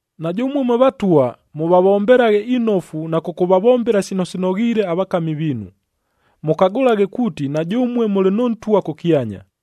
Na jʉmue mwe vatwa, mʉvavombelaghe inofu na kʉkʉvavombela sino sinoghiile avakami viinu, mʉkagʉlaghe kuuti na jʉmue mʉlɨ nʉ Ntwa kʉkyanya.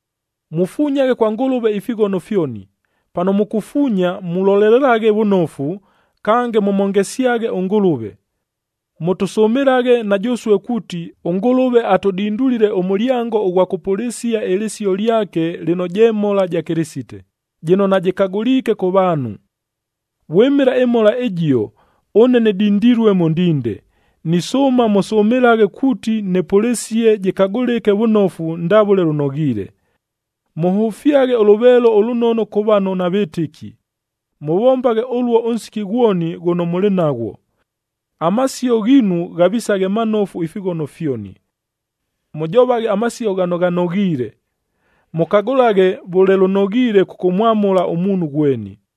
Mufunyaghe kwa Ngʉlʉve ifighono fyoni. Pano mukufuunya mulolelelaghe vʉnofu, kange mʉmhongesyaghe ʉNgʉlʉve. Mʉtʉsʉmɨlaghe na jʉsue kuuti, ʉNgʉlʉve atʉdindulile ʉmʉlyango ʉghwa kʉpʉlɨsia ɨlɨsio lyake lɨno je mhola ja Kɨlɨsite, jɨno najɨkagʉliike kʉ vaanhu. Vwɨmɨla ɨmhola ɨjio, ʉne nɨdindilue mʉ ndinde. Nisʉʉma mʉsʉmɨlaghe kuuti nɨpʉlɨsie jɨkagʉlɨke vʉnofu ndavʉle lʉnoghiile. Mʉhʉfyaghe ʉlʉveelo ʉlʉnono kʉ vano navɨtɨki. Mʉvombaghe ʉluo ʉnsiki ghwoni ghʉno mʉlɨ naghwo. Amasio ghiinu ghavisaghe manofu ifighono fyoni. Mʉjovaghe amasio ghano ghanoghiile. Mʉkagʉlaghe vʉle lʉnoghiile kʉkʉmwamʉla ʉmuunhu ghweni.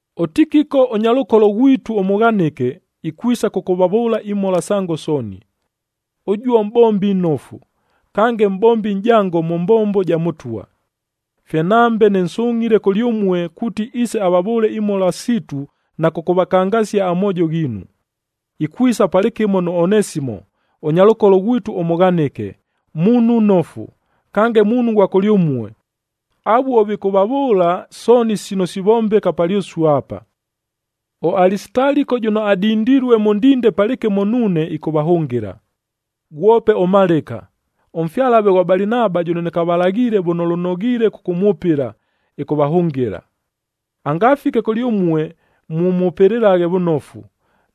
ɄTikiko ʉnyalʉkolo ghwitu ʉmʉghanɨke, ikwisa kʉkʉvavʉʉla imhola sango sooni. Ʉjuo mʼbombi nnofu, kange mʼbombi nʼjango mʉ mbombo ja Mʉtwa. Fye nambe nɨnsungʼhile kʉlyʉmue kuuti iise avavʉʉle imhola siitu na kʉkʉvakangasia amoojo ghiinu. Ikwisa palɨkɨmo nʉ Onesimo, ʉnyalʉkolo ghwitu ʉmʉghanɨke, muunhu nnofu, kange muunhu ghwa kʉlyʉmue. Avuo vikʉvavʉʉla sooni sino sivombeka palyʉsue apa. ɄAlisitaliko jʉno adindilue mʉ ndinde palɨkɨmo nuune ɨkʉvahʉngɨla. Ghwope ʉMalɨka, ʉmfyalave ghwa Balinaba jʉno nɨkavalaghiile vʉle lʉnoghiile kʉkʉmwʉpɨla, ɨkʉvahʉngɨla. Angafike kʉlyʉmue mʉmwʉpɨlaghe vʉnofu.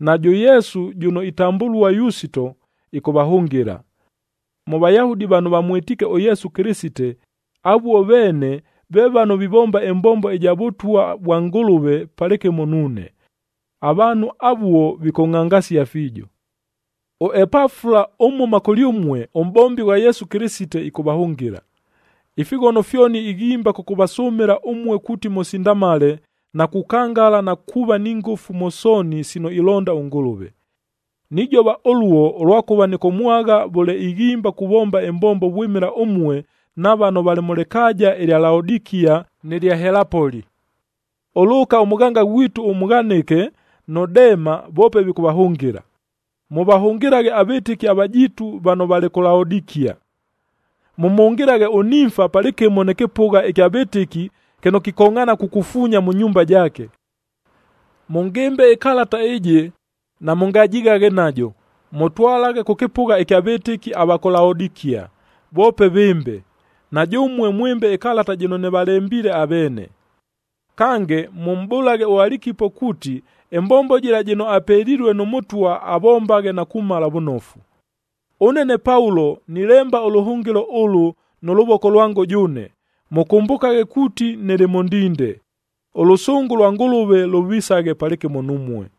Najʉ Yesu jʉno itambʉlua Yusito, ɨkʉvahʉngɨla. Mʉ Vayahudi vano vamwɨtiike ʉYesu Kɨlɨsite, avuo veene, ve vano vivomba ɨmbombo ɨja Vʉtwa vwa Ngʉlʉve palɨkɨmo nuune. Avaanhu avuo vikʉngʼhangasia fiijo. ɄEpafula, ʉmhʉma kʉlyʉmue, ʉmʼbombi ghwa Yesu Kɨlɨsite, ɨkʉvahʉngɨla. Ifighono fyoni ighimba kʉkʉvasʉmɨla ʉmue kuuti mʉsindamale na kukangala na kuuva ni ngʉfu mʉ sooni sino ilonda ʉNgʉlʉve. Nijova ʉluo, ʉlwakʉva nɨkʉmwagha vʉle ighimba kuvomba ɨmbombo vwɨmɨla ʉmue na vano valɨ mʉ lɨkaaja ɨlya Laodikia nɨ lya Helapoli. ɄLʉʉka ʉmʉghanga ghwitu ʉmʉghanɨke, nʉ Dema voope vikʉvahʉngɨla. Mʉvahʉngɨlaghe avɨtɨki avajiitu vano valɨ kʉ Laodikia. Mʉmhʉngɨlaghe ʉNimfa palɨkɨmo nɨ kɨpʉgha ɨkya vɨtɨki kɨno kikongʼhaana kukufuunya mʉ nyumba jaake. Mʉngɨmbe ɨkalata ɨjɨ, namʉngajighaghe najo, mʉtwalaghe kʉ kɨpʉgha ɨkya vɨtɨki ava kʉ Laodikia voope vɨmbe, na jʉmue mwɨmbe ɨkalata jɨno nɨvalembiile aveene. Kange, mʉmʼbʉlaghe ʉAlikipo kuuti ɨmbombo jɨla jɨno apelilue nʉ Mʉtwa avombaghe na kumala vʉnofu. Ʉne ne Paulo nilemba ʉlʉhʉngɨlo ʉlʉ nʉ lʉvoko lwango jʉʉne. Mʉkʉmbʉkaghe kuuti nɨlɨ mʉ ndinde. Ʉlʉsʉngʉ lwa Ngʉlʉve lʉvisaghe palɨkɨmo numue.